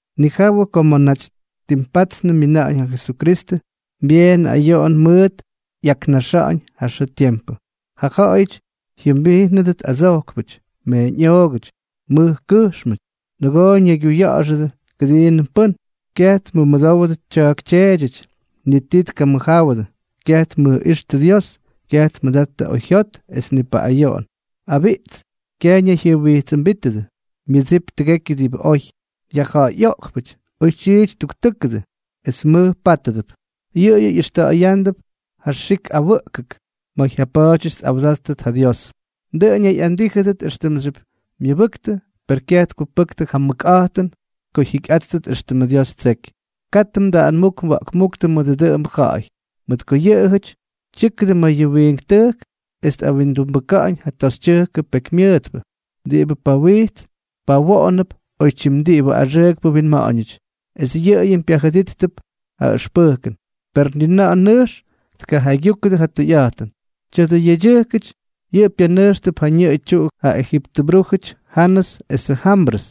Nijawʉ ko ma̱ naty ttimpatnʉ myina̱ꞌa̱ñ ja Jesukristʉ, byeen ayoꞌon mʉʉt ꞌyaknaxa̱ꞌa̱ñ ja xʉʉ tiempʉ. Ja ja̱ꞌa̱yʉty jyʉmbijnʉdʉt adsojkpʉty, meeñꞌoogʉty, mʉj kʉjxmʉty, nʉgoo ñaygyuya̱ꞌa̱xʉdʉ kʉdiinʉm pʉ́n, kyaj tmʉmʉdowdʉ tya̱a̱k tyeedyʉty, ni ti tkamʉjjáwʉdʉ, kyaj tmʉjꞌíxtʉ Dios, kyaj tmʉdattʉ ja oyjyot es ni paꞌꞌayoꞌon, abiꞌts, kyaj ñayjyʉjwijtsʉmbítʉdʉ, myʉdsip tʉgekyʉ diꞌibʉ oy, yajja̱ꞌa̱yꞌoꞌkpʉty, oytyiity ttuktʉ́kʉdʉ, es mʉj pátʉp. Yʉꞌʉyʉ ꞌyʉxta̱ꞌa̱yándʉp ja xik awʉꞌkʉk ma̱ jyapa̱a̱dyʉty tꞌawdáttʉt ja Dios. Dʉꞌʉn ñayꞌandíjʉdʉt éxtʉmxyʉp myʉbʉktʉ, per kyaj tkupʉktʉ ja mʉkꞌa̱jtʉn ko jyikyꞌáttʉt éxtʉmʉ Dios ttseky. Katʉ mdaꞌanmúk mwa̱ꞌkmúktʉ mʉdʉ dʉꞌʉmbʉ ja̱ꞌa̱y. Mʉt ko yʉꞌʉjʉty tyʉ́kʉdʉ ma̱ yʉ wiink tʉjk es tꞌawindumbʉka̱ꞌa̱ñ ja toxytyʉjkʉ pekymyʉʉtpʉ, diꞌibʉ pawijts pawoꞌonʉp oytyim diꞌibʉ axʉʉkpʉ winma̱ꞌa̱ñʉty, es yʉꞌʉyʉm pyajʉdijttʉp ja ʉxpʉjkʉn, per ni na̱ꞌa̱ nʉjx tkajaygyúkʉdʉ ja tʉyꞌa̱jtʉn. Tya̱dʉ yedyʉjkʉty yʉꞌʉ pyanʉjxtʉp ja ñʉꞌʉ tyuꞌu ja ejiptʉ brújʉty Janʉs esʉ Jambrʉs,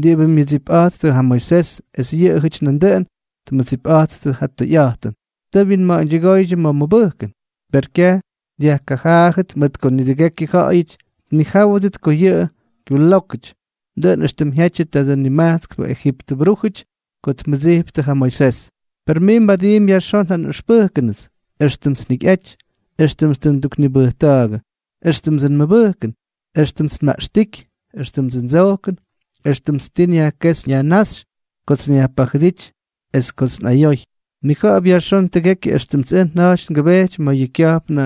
diꞌibʉ myʉdsijpꞌa̱jtʉ ja Moisés, es yʉꞌʉjʉty nandʉꞌʉn tmʉdsipꞌattʉ ja tʉyꞌa̱jtʉn. Tʉ wyinma̱ꞌa̱ñdyʉgóydyʉ ma̱ mʉbʉjkʉn. Per kyaj dyajkajaajʉt, mʉt ko nidʉgekyʉ ja̱ꞌa̱yʉty tnijáwʉdʉt ko yʉꞌʉ kyulókʉty, dʉꞌʉn éxtʉm jyajtyʉ tadʉ nimajtskpʉ ejiptʉ brújʉty ko tmʉdsijptʉ ja Moisés. Per mij mbadiimpy yajxón ja nꞌʉxpʉjkʉnʉts, éxtʉmts njikyꞌaty, éxtʉmts tʉ nduknibʉjta̱a̱gʉ, éxtʉmdsʉ nmʉbʉjkʉn, éxtʉmts nmaꞌxtíky, éxtʉmdsʉ ndsojkʉn, éxtʉmts tii nyajkéxy nyajnáxy, kots nyajpajʉdíty es kots nꞌayoy. Mnija̱ꞌa̱p yajxón tʉgekyʉ éxtʉmts ʉj nja̱jty ngʉbejty ma̱ yʉ kya̱jpnʉ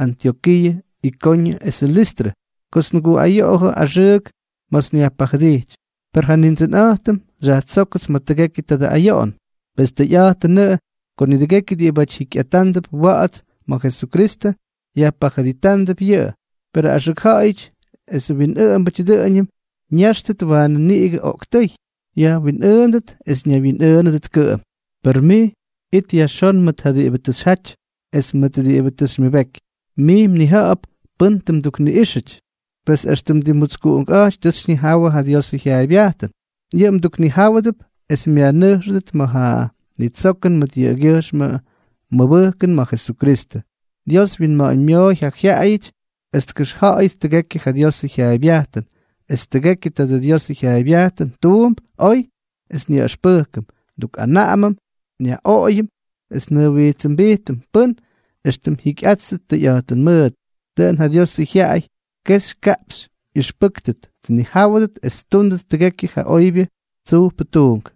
Antyokiiʉ, Ikoñʉ es Listrʉ, kots nguꞌayoꞌojʉ axʉʉk ma̱ts nyajpajʉdijty. Per ja Nindsʉnꞌa̱jtʉm xyajtsókʉts ma̱ tʉgekyʉ tadʉ ayoꞌon. Pes tʉyꞌa̱jtʉnʉꞌʉ ko nidʉgekyʉ diꞌibáty jikyꞌatándʉp wa̱ꞌa̱ts ma̱ Jesukristʉ, yajpajʉditándʉp yʉꞌʉ. Perʉ axʉk ja̱ꞌa̱yʉty esʉ winꞌʉꞌʉmbʉty dʉꞌʉñʉm ñʉjxtʉt waanʉ niꞌigʉ oꞌktʉ́y, jyaꞌaywyinꞌʉʉndʉt es ñaywyinꞌʉʉnʉdʉt kʉꞌʉm. Per mij, it yajxón mʉt ja diꞌibʉ tʉ xyjaty es mʉt diꞌibʉ tʉ xymyʉbeky. Mij mnija̱ꞌa̱p pʉ́n tʉ mdukniꞌíxʉty. Pes extʉ tʉ mdimmutskuꞌunkꞌáty tʉ xyñijawʉ ja Diosʉ jyaaybyajtʉn. Yʉꞌʉ mduknijáwʉdʉp es myajnʉjxʉdʉt ma̱ ja nitsokʉn mʉt yʉꞌʉgyʉjxmʉ mmʉbʉjkʉn ma̱ Jesukristʉ. Dios wyinma̱ꞌa̱ñmyooy ja jyaꞌayʉty es tkʉxja̱ꞌa̱yʉt tʉgekyʉ ja Diosʉ jyaaybyajtʉn, es tʉgekyʉ tadʉ Diosʉ jyaaybyajtʉn tuump oy es nyaꞌʉxpʉjkʉm, ndukꞌanaꞌamʉm, nyaꞌoꞌoyʉm, es njʉjwijtsʉmbijtʉm pʉ́n éxtʉm jyikyꞌátʉt tʉyꞌa̱jtʉn mʉʉt, dʉꞌʉn ja Diosʉ jyaꞌay kexy kaꞌpxy ꞌyʉxpʉ́ktʉt, tnijáwʉdʉt es ttúndʉt tʉgekyʉ ja oybyʉ tsujpʉ tuunk.